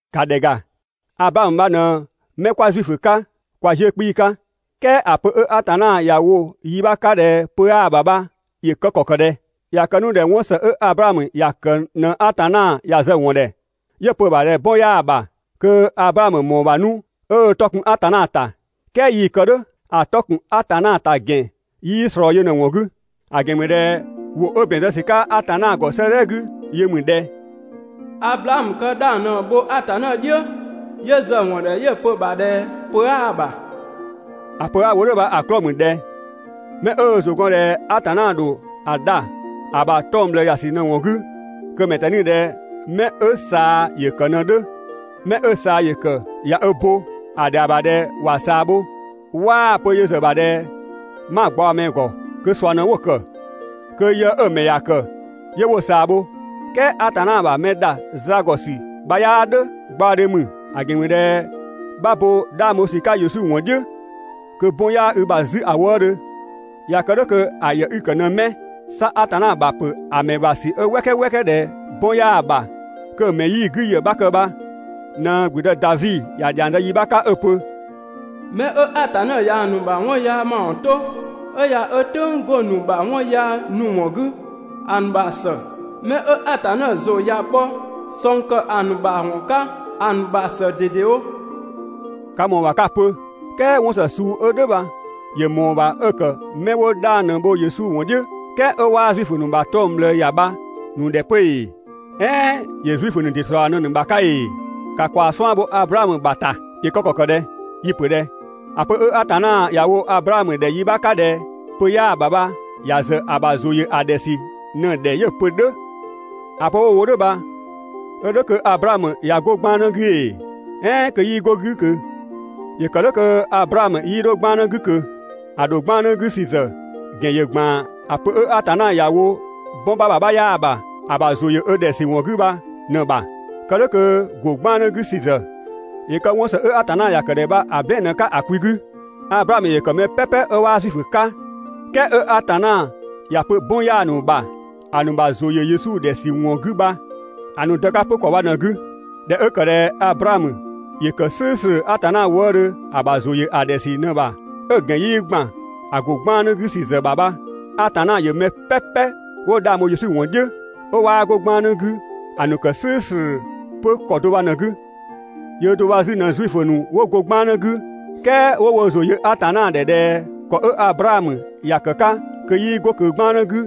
‑Ka ‑dhɛ ‑ga, Ablaamö bha ꞊në 'mɛ 'kwa Zuifö 'ka kwa 'ziʋ̈‑ 'kpii‑ 'ka. "Kɛɛ ‑a pö 'ö Atanna ‑ya wo yi 'bha 'ka ꞊dhɛ pö 'yaa‑ ‑bha bha ‑yö kë ‑kɔ ‑kë ꞊dhɛ? ꞊Ya kë 'nu ꞊dhɛ 'wɔn ‑së 'ö Ablaamö ‑ya ‑kë ꞊në Atanna ‑ya zë‑ ‑wɔn ‑dhɛ 'yö‑ pö‑ ‑bha ꞊dhɛ 'bɔn 'yaa‑ ‑bha, kö Ablaamö ‑mɔɔ ‑bha 'nu 'ö 'tɔ kun Atanna ‑ta. "kɛɛ 'yii‑ kë "dhʋ̈. ‑A 'tɔ ‑kun Atanna ‑ta ‑gɛn 'yii ꞊slɔɔ yö ꞊në‑ ‑wɔn 'gü. ‑A ‑gɛn ‑mü ꞊dhɛ ‑wʋ 'ö ‑bɛn zë ‑sü 'ka Atanna ‑gɔ 'sëëdhɛ 'gü yö ‑mü ꞊dhɛ: «Ablaamö kë 'dhang ꞊në‑ bho Atanna "dhiʋ̈, 'yö zë‑ ‑wɔn ‑dhɛ 'yö‑ pö‑ ‑bha ꞊dhɛ pö 'aa‑ ‑bha.» ‑A pö 'a‑ wo "dhʋ̈ bha‑ 'klɔɔ‑ ‑mü ꞊dhɛ 'mɛ 'ö ö ‑zʋ gɔn ꞊dhɛ Atanna ‑dho ö dha ‑a ‑bha 'tɔng‑ ꞊bhlëë ‑ya ‑sü ꞊në‑ ‑wɔn 'gü, kö‑ ‑mɛ ꞊tɛni ꞊dhɛ 'mɛ 'ö ꞊saa ‑yë ‑kë ꞊në‑ 'dhö. 'Mɛ 'ö ꞊saa ‑yë ‑kë ꞊ya ö bo, ‑a ‑dhɛa ‑bha ꞊dhɛ ‑wa ꞊saa bho, 'waa‑ pö yö ‑zë ‑bha ꞊dhɛ 'ma gbaɔ‑ ‑mɛ ‑gɔ. Kö ꞊sua ꞊në 'wo‑ ‑kë, kö yë 'ö‑ ‑mɛ ‑ya ‑kë 'yö 'wo‑ ꞊saa bho. "Kɛɛ Atanna ‑bha mɛ ‑dha za ‑gɔ ‑sü bha 'yaa "dhʋ̈, gbaɔdhe ‑mü. ‑A ‑gɛn ‑mü ꞊dhɛ 'bha bo 'dhang bho ‑sü ‑zë 'ka Yesu ‑wɔn "dhiʋ̈ kö 'bɔn 'yaa i ‑bha 'zü ‑a wëëdhö. ꞊Ya kë "dhʋ̈ kö ‑a ‑yë 'i‑ ‑kë ꞊në 'mɛ? 'Sa Atanna ‑bha ‑a ‑pö mɛ ‑bha ‑sü 'ö "wɛkɛ "wɛkɛ ꞊dhɛ 'bɔn 'yaa‑ ‑bha kö‑ ‑mɛ 'yii‑ 'gü ‑yë 'bha kë bha ꞊në ‑gblüdë Davi ‑ya ‑dhiang zë yi 'bha 'ka 'ö‑ pö: «'Mɛ 'ö Atanna ꞊yaa‑ ‑nu ‑mawɔn 'to, 'ö ꞊ya ö "tʋ̈ng 'go‑ ‑nu ‑bha 'wɔn yaa ‑nu ‑wɔn 'gü, ‑a ‑nu ‑bha ‑së. 'Mɛ 'ö Atanna ‑zʋ ꞊ya bhɔ ꞊sɔng ‑kë ‑a ‑nu ‑bha ‑wɔn 'ka, ‑a ‑nu ‑bha ‑së ꞊dedewo.» Ka ‑mɔɔ ‑bha 'ka‑ pö: "Kɛɛ 'wɔn ‑së 'ö suu 'dhö "dhʋ̈ bha ‑yö ‑mɔɔ ‑bha 'ö ‑kë 'mɛ 'wo 'dhang ꞊në‑ bho Yesu ‑wɔn "dhiʋ̈, "kɛɛ 'ö 'waa Zuifö ‑nu ‑bha 'tɔng‑ ꞊bhlëë ‑ya bha‑ ‑nu ‑dhɛ 'pö ‑ee, "ɛɛn ‑yö Zuifö ‑nu ‑dɩ ‑slɔɔ ꞊në‑ ‑nu ‑bha 'ka ‑ee? ‑Ka ‑kwaa 'suan‑ bho Ablaamö ‑bha ‑ta. ‑Yö kë ‑kɔ ‑kë ꞊dhɛ? Yi‑ ‑pö ꞊dhɛ: ‑A pö 'ö Atanna ‑ya wo Ablaamö ‑dhɛ yi 'bha 'ka ꞊dhɛ pö 'yaa‑ ‑bha bha ‑ya ‑zë ‑a ‑bha ‑zʋ ‑yö ö ‑dhɛ ‑sü ꞊në‑ ‑dhɛ 'yö‑ pö "dhʋ̈. ‑A pö 'ö‑ wo "dhʋ̈ bha 'ö "dhʋ̈ kö Ablaamö ꞊ya 'go 'gbannë 'gü ‑ee, "ɛɛn kö 'yii 'go‑ 'gü ꞊kö? ‑Yö ‑kë "dhʋ̈ kö Ablaamö 'yii 'dho 'gbannë 'gü ꞊kö. ‑A ‑dho 'gbannë 'gü ‑sü ‑zë ‑gɛn ‑yö ‑gban ‑a pö 'ö Atanna ‑ya wo 'bɔn 'bha ‑bha 'bha 'yaa‑ ‑bha ‑a ‑bha ‑zʋ ‑yö ‑a ‑dhɛ ‑sü ‑wɔn 'gü bha ꞊në‑ ‑bha. Kë "dhʋ̈ kö ‑go 'gbannë 'gü ‑sü ‑zë ‑yö kë 'wɔn ‑së 'ö Atanna ‑ya ‑kë ‑dhɛ bha‑ "blɛɛn‑ ꞊në‑ 'ka ‑a kwi 'gü. Ablaamö ‑yö ‑kë mɛ "pɛpɛ 'ö 'waa Zuifö 'ka, "kɛɛ 'ö Atanna ‑ya pö 'bɔn 'yaa‑ ‑nu ‑bha ‑a ‑nu ‑bha ‑zʋ ‑yö Yesu ‑dhɛ ‑wɔn 'gü bha‑ ‑nu dë 'ka 'pö ‑kɔ bha ꞊në‑ 'gü. ꞊Dhɛ 'ö ‑kë ꞊dhɛ Ablaamö ‑yö ‑kë "slʋ̈ʋ̈slʋ̈ Atanna wëëdhö ‑a ‑bha ‑zʋ ‑yö ‑a ‑dhɛ ‑sü ꞊në‑ ‑bha, 'ö‑ ‑gɛn 'yii ‑gban ‑a ‑go 'gbannë 'gü ‑sü ‑zë ‑bha bha, Atanna ‑yö mɛ "pɛpɛ 'wo 'dhang bho Yesu ‑wɔn "dhiʋ̈, 'ö 'waa 'go 'gbannë 'gü ‑a ‑nu ‑kë "slʋ̈ʋ̈slʋ̈ 'pö ‑kɔ do bha ꞊në‑ 'gü. Yöö do bha 'zü ꞊në Zuifö ‑nu 'wo go 'gbannë 'gü, "kɛɛ 'ö 'wo wo ‑zʋ yö Atanna ‑dhɛ ꞊dhɛ ‑kɔ 'ö Ablaamö ‑ya ‑kë 'ka kö 'yii 'go ꞊kö 'gbannë 'gü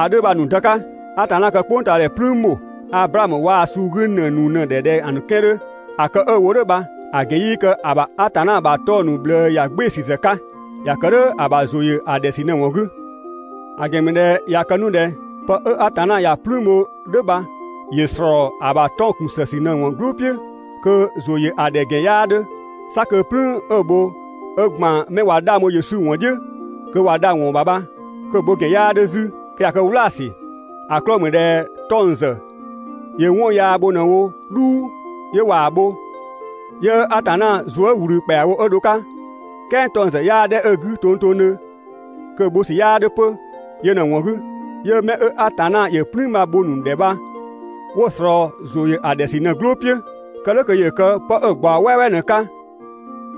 ‑a 'dhö bha‑ ‑nu dë 'ka. Atanna kë "kpʋngtaadhɛ "plüün ‑bho Ablaamö waa‑ suu 'gü ‑në ‑nu ‑dhɛ ꞊dhɛ‑ ‑nu 'kɛan‑ 'dhö. ‑A kë 'ö‑ wo "dhʋ̈ bha‑ ‑gɛn 'yii kë ‑a ‑bha Atanna ‑bha 'tɔng‑ ‑nu ꞊bhlëë ‑ya "gbɩɩ‑ ‑sü ‑zë 'ka. ‑Ya ‑kë "dhʋ̈ ‑a ‑bha ‑zʋ ‑yö ‑a ‑dhɛ ‑sü ꞊në‑ ‑wɔn 'gü. ‑A ‑gɛn ‑mü ꞊dhɛ ꞊ya kë 'nu ꞊dhɛ pë 'ö Atanna ‑ya "plüün bho "dhʋ̈ bha ‑yö ‑slɔɔ ‑a ‑bha 'tɔng‑ ‑kun ‑së ‑sü ꞊në "gblʋʋ "piʋ̈, kö ‑zʋ ‑yö ‑a ‑dhɛ ‑gɛn 'yaa 'dhö. 'Sa kö "plüün 'ö‑ bho 'ö ‑gban 'mɛ ꞊wa 'dhang bho Yesu "dhiʋ̈ kö ꞊wa dha ‑wɔn ‑bha bha, kö‑ bho ‑gɛn 'yaa 'dhö 'zü, kö ꞊ya kë "wlaasü. ‑A 'klɔɔ‑ ‑mü ꞊dhɛ 'tɔng‑ ‑zë ‑yö 'wɔn yaa bho ꞊në‑ wo "dhuu, 'yö ꞊waa‑ bho, 'yö Atanna zuë" ꞊wlü ‑kpɛawo 'ö dho‑ 'ka, "kɛɛ 'tɔng‑ ‑zë 'yaa ‑dhɛ 'ö‑ 'gü tongtongdhö, kö‑ bho ‑sü 'yaa 'dhö 'pö. Yö ꞊në‑ ‑wɔn 'gü, 'yö 'mɛ 'ö Atanna ‑yö "plüün bha‑ bho‑ ‑nu ‑dhɛ bha 'wo‑ ꞊slɔɔ ‑zʋ ‑yö ‑a ‑dhɛ ‑sü ꞊në‑ "gblʋʋ "piʋ̈. Kë "dhʋ̈ kö ‑yö kë 'pë 'ö‑ ꞊gbaɔ "wɛɛwɛɛ ꞊në‑ 'ka,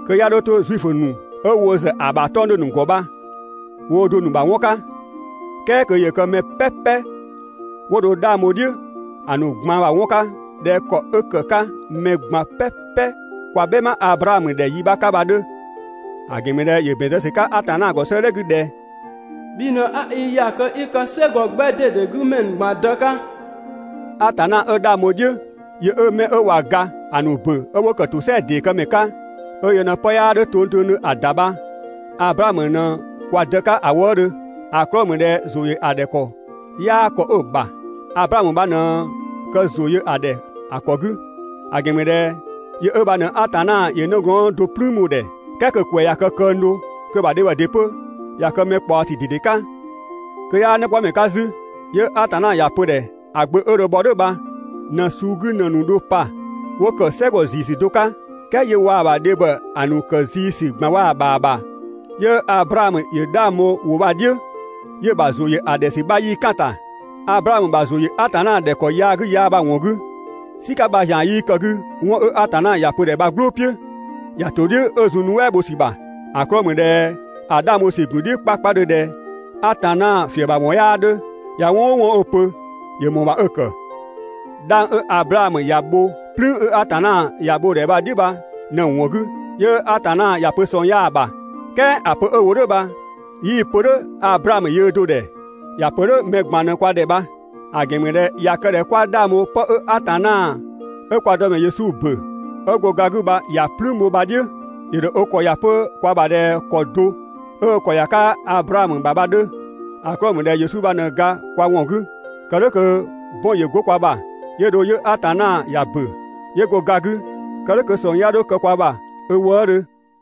kö 'ya 'dho 'to Zuifö ‑nu 'ö wo ‑zë ‑a ‑bha 'tɔng‑ 'dhö‑ ‑nu ‑gɔ bha woo do‑ ‑nu ‑bha 'wɔn 'ka, "kɛɛ kö ‑yö kë mɛ "pɛpɛ 'wo dho 'dhang bho‑ "dhiʋ̈ ‑a ‑nu ꞊gban ‑bha 'wɔn 'ka ꞊dhɛ ‑kɔ 'ö ‑kë 'ka mɛ ꞊gban "pɛpɛ kwa "bhɛma Ablaamö ‑dhɛ yi 'bha 'ka bha‑ 'dhö. ‑A ‑gɛn ‑mü ꞊dhɛ ‑yö ‑bɛn zë ‑sü 'ka Atanna ‑gɔ 'sëëdhɛ 'gü ꞊dhɛ: «Bhi ꞊në 'a i ‑ya kö 'i kë "sɛgɔ 'gbɛ ꞊dede 'gü ‑mɛ ‑nu ꞊gban dë 'ka.» Atanna 'ö 'dhang bho‑ "dhiʋ̈, yö 'ö 'mɛ ꞊wa ga ‑a ‑nu ‑bö 'ö 'wo ‑kë ‑tosɛa ‑dee këmɛ 'ka, 'ö yö ꞊në 'pë 'yaa 'dhö tongtongdhö ‑a ‑da bha Ablaamö ꞊në kwa dë 'ka ‑a wëëdhö. ‑A 'klɔɔ‑ ‑mü ꞊dhɛ ‑zʋ ‑yö ‑a ‑dhɛ ‑kɔ 'yaa ‑kɔ 'ö‑ ‑bha, Ablaamö bha ꞊në kë ‑zʋ yö‑ ‑dhɛ ‑a 'kɔ 'gü. ‑A ‑gɛn ‑mü ꞊dhɛ yö 'ö bha ꞊në Atanna ‑yö nëgɔɔn do "plüün bho‑ ‑dhɛ, "kɛɛ kö‑ ‑kwɛ ꞊ya kë këng do, kö‑ ‑bha dhebhɔ ‑dɩ 'pö ꞊ya kë mɛ ꞊kpaɔsü ꞊dede 'ka, kö 'yaa 'nëkpɔmɛ 'ka 'zü, 'yö Atanna ‑ya pö‑ ‑dhɛ ‑a Gbö 'ö dho bhɔ "dhʋ̈ bha ꞊në‑ suu 'gü ‑në ‑nu dho pa 'wo ‑kë "sɛgɔ ‑zii ‑sü do 'ka, "kɛɛ 'yö waa‑ ‑bha dhebhɔ ‑a ‑nu ‑kë zii ‑sü ꞊gban waa‑ ‑bha ‑bha, 'yö Ablaamö ‑yö 'dhang bho‑ ‑wʋ bha‑ "dhiʋ̈, 'yö‑ ‑bha ‑zʋ ‑yö ‑a ‑dhɛ ‑sü 'bha 'yii "kan‑ ‑ta. Ablaamö ‑bha ‑zʋ ‑yö Atanna ‑dhɛ ‑kɔ yaa 'gü yaa bha‑ ‑wɔn 'gü, "sika 'bha ‑zian 'yii kë‑ 'gü 'wɔn 'ö Atanna ‑ya pö‑ ‑dhɛ bha‑ "gblʋʋ "piʋ̈, ‑ya ‑to "dhiʋ̈ 'ö zun‑ nuɛ" bho ‑sü ‑bha. ‑A 'klɔɔ‑ ‑mü ꞊dhɛ ‑a 'dhang bho ‑sü ‑gun "dhiʋ̈ 'kpakpadhö ꞊dhɛ Atanna ‑fiëbhawɔn 'yaa 'dhö, ꞊ya 'wɔn "ʋʋ 'wɔn 'ö‑ pö, ‑yö ‑mɔɔ ‑bha 'ö‑ ‑kë. 'Dhang 'ö Ablaamö ‑ya bho "plüün 'ö Atanna ‑ya bho‑ ‑dhɛ bha‑ "dhiʋ̈ "dhʋ̈ bha ꞊në‑ ‑wɔn 'gü, 'yö Atanna ‑ya pö ꞊sɔng 'yaa‑ ‑bha. "Kɛɛ ‑a pö 'ö‑ wo "dhʋ̈ bha 'yii‑ pö "dhʋ̈ Ablaamö yöö do‑ ‑dhɛ. ‑Ya ‑pö "dhʋ̈ mɛ ꞊gban ꞊në kwa ‑dhɛ bha. ‑A ‑gɛn ‑mü ꞊dhɛ ꞊ya kë ꞊dhɛ 'kwa 'dhang bho 'pë 'ö Atanna 'ö kwa Dëmɛ Yesu ‑bö 'ö go ga 'gü bha ‑ya "plüün bho bha‑ "dhiʋ̈, ‑yö ‑dho ö ‑kɔ ‑ya 'pö kwa ‑bha ꞊dhɛ ‑kɔ do 'ö ö ‑kɔ ‑ya 'ka Ablaamö ‑bha bha‑ 'dhö. ‑A 'klɔɔ‑ ‑mü ꞊dhɛ Yesu bha ꞊në ga kwa ‑wɔn 'gü, kë "dhʋ̈ kö 'bɔn ‑yö 'go kwa ‑bha. 'Yö dho 'yö Atanna ‑ya ‑bö, 'yö go ga 'gü, kë "dhʋ̈ kö ꞊sɔng 'ya 'dho kë kwa ‑bha ö wëëdhö.